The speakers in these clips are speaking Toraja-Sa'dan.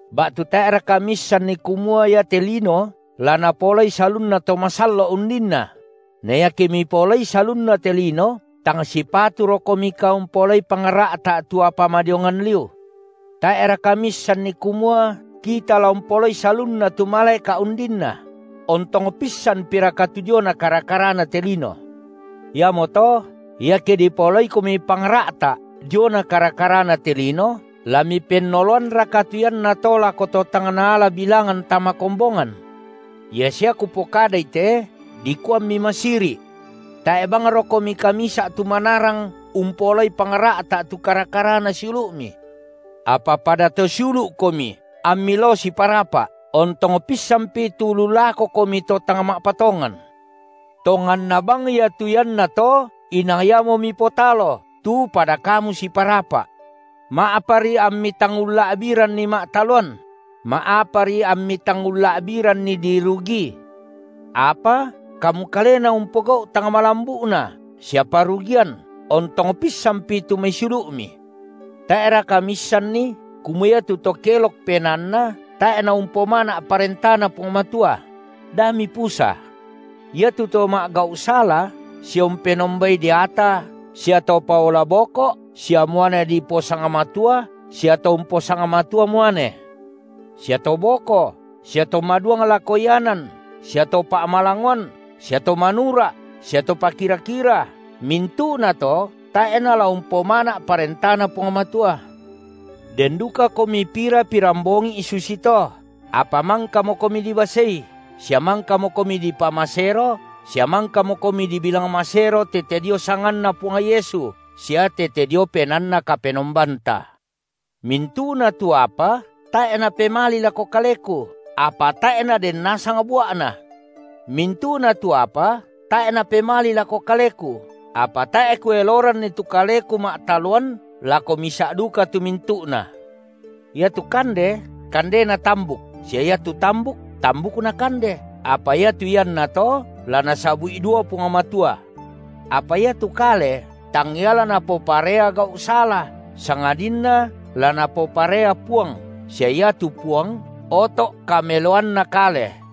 Ba’tu tae’raka miissanni kumua iate lino la napaolai salunna to masallo’ undinna? Na iake mipaolai salunna te lino, tang sipaturokomika umpaolai pangra’ta’ tu apa madiongan liu? Tae’raka miissan kumua kita la umpaolai salunna tu malaeka’ undinna? Ontong pissanpiraka tu diona kara-karana te lino? Iamoto iake dipaolaikomi pangra’ta’ diona kara-karana te lino, la mipennoloanraka tu iannato lako to tang naala bilangan tama kombongan? Ia sia kupokadai te, dikua ammi masiri’. Tae’ bangrokomika misa’ tu manarang, umpaolai pangra’ta’ tu kara- karana siulu’mi? Apa pada to siulu’komi ammi lao siparapa’, ontong pissanpi tu lu lakokomi to tang ma’patongan. Tonganna bang iatu iannato inang iamo mipotalo, tu pada kamu siparapa’. Ma’apari ammi tang ulla’biranri ma’taloan? Ma’apari ammi tang ulla’biranri dirugii? Apa kamu kalena umpogau’ tang malambu’na sia parugian, ontong pissanpi tu mai siulu’mi! Tae’raka miissanni kumua iatu to kelok penaanna tae’ naumpomana’ ParentaNa Puang Matua? Da mipusa. Iatu to ma’gau’ sala sia umpenombai deata, sia to paola boko’ sia muane diposangmatua sia to umposangmatua muane, sia to boko sia to maduang lako ianan sia to pa’malangoan sia to manura’ sia to pakira-kira, mintu’nato tae’ nala umpomana’ ParentaNa Puang Matua. Den dukakomi pira pirambongi’ susito, apa mangkamokomi dibasei, sia mangkamokomi dipamasero sia mangkamokomi dibilang masero tete dio sanganNa Puang Yesu sia tete dio PenaanNa Kapenombanta. Mintu’na tu apa tae’ napemali lako kaleku, apa tae’ naden nasang bua’na. Mintu’na tu apa tae’ napemali lako kaleku apa tae’ kueloranni tu kaleku ma’taloan lako misa’ duka tu mintu’na. Iatu kande kandena tambuk, sia iatu tambuk tambukna kande, apa iatu iannato la Nasabu’i dua Puang Matua. Apa iatu kale tangia la napoparea gau’ sala, sangadinna la Napoparea Puang, sia iatu Puang oto’ kameloanna kale.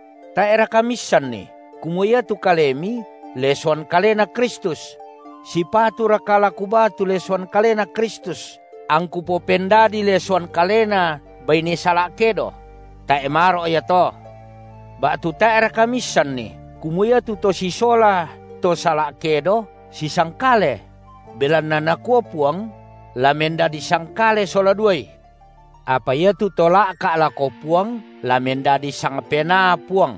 Tae’raka miissanni kumua iatu kalemi lesoan Kalena Kristus? Sipaturaka la kubaa tu lesoan Kalena Kristus, angku popendadii lesoan kalena baine sala’ kedo? Tae’ maro’ ia to. Ba’tu tae’raka miissanni kumua iatu to sisola to sala’ kedo, sisangkale? Belanna Nakua Puang: La mendadi sangkale sola duai. Apa iatu to la’ka’ lako Puang la mendadi sangpenaa Puang.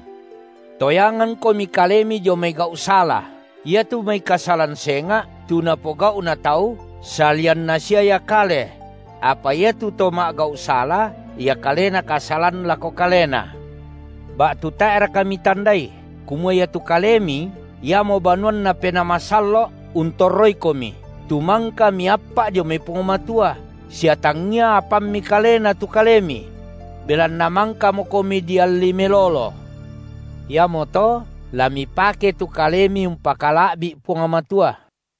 Toyangangkomi kalemi dio mai gau’ sala! Iatu mai kasalan senga’, tu napogau’na tau, salianna sia ia kale; apa iatu to ma’gau’ sala, ia kalena kasalan lako kalena. Ba’tu tae’raka mitandai kumua iatu kalemi, iamo banuanNa Penaa Masallo’ untorroikomi, tu mangka miappa’ dio mai Puang Matua, sia tangia apammi kalena tu kalemi? Belanna mangkamokomi dialli melolo. Iamoto la mipake tu kalemi umpakala’bi’ Puang Matua.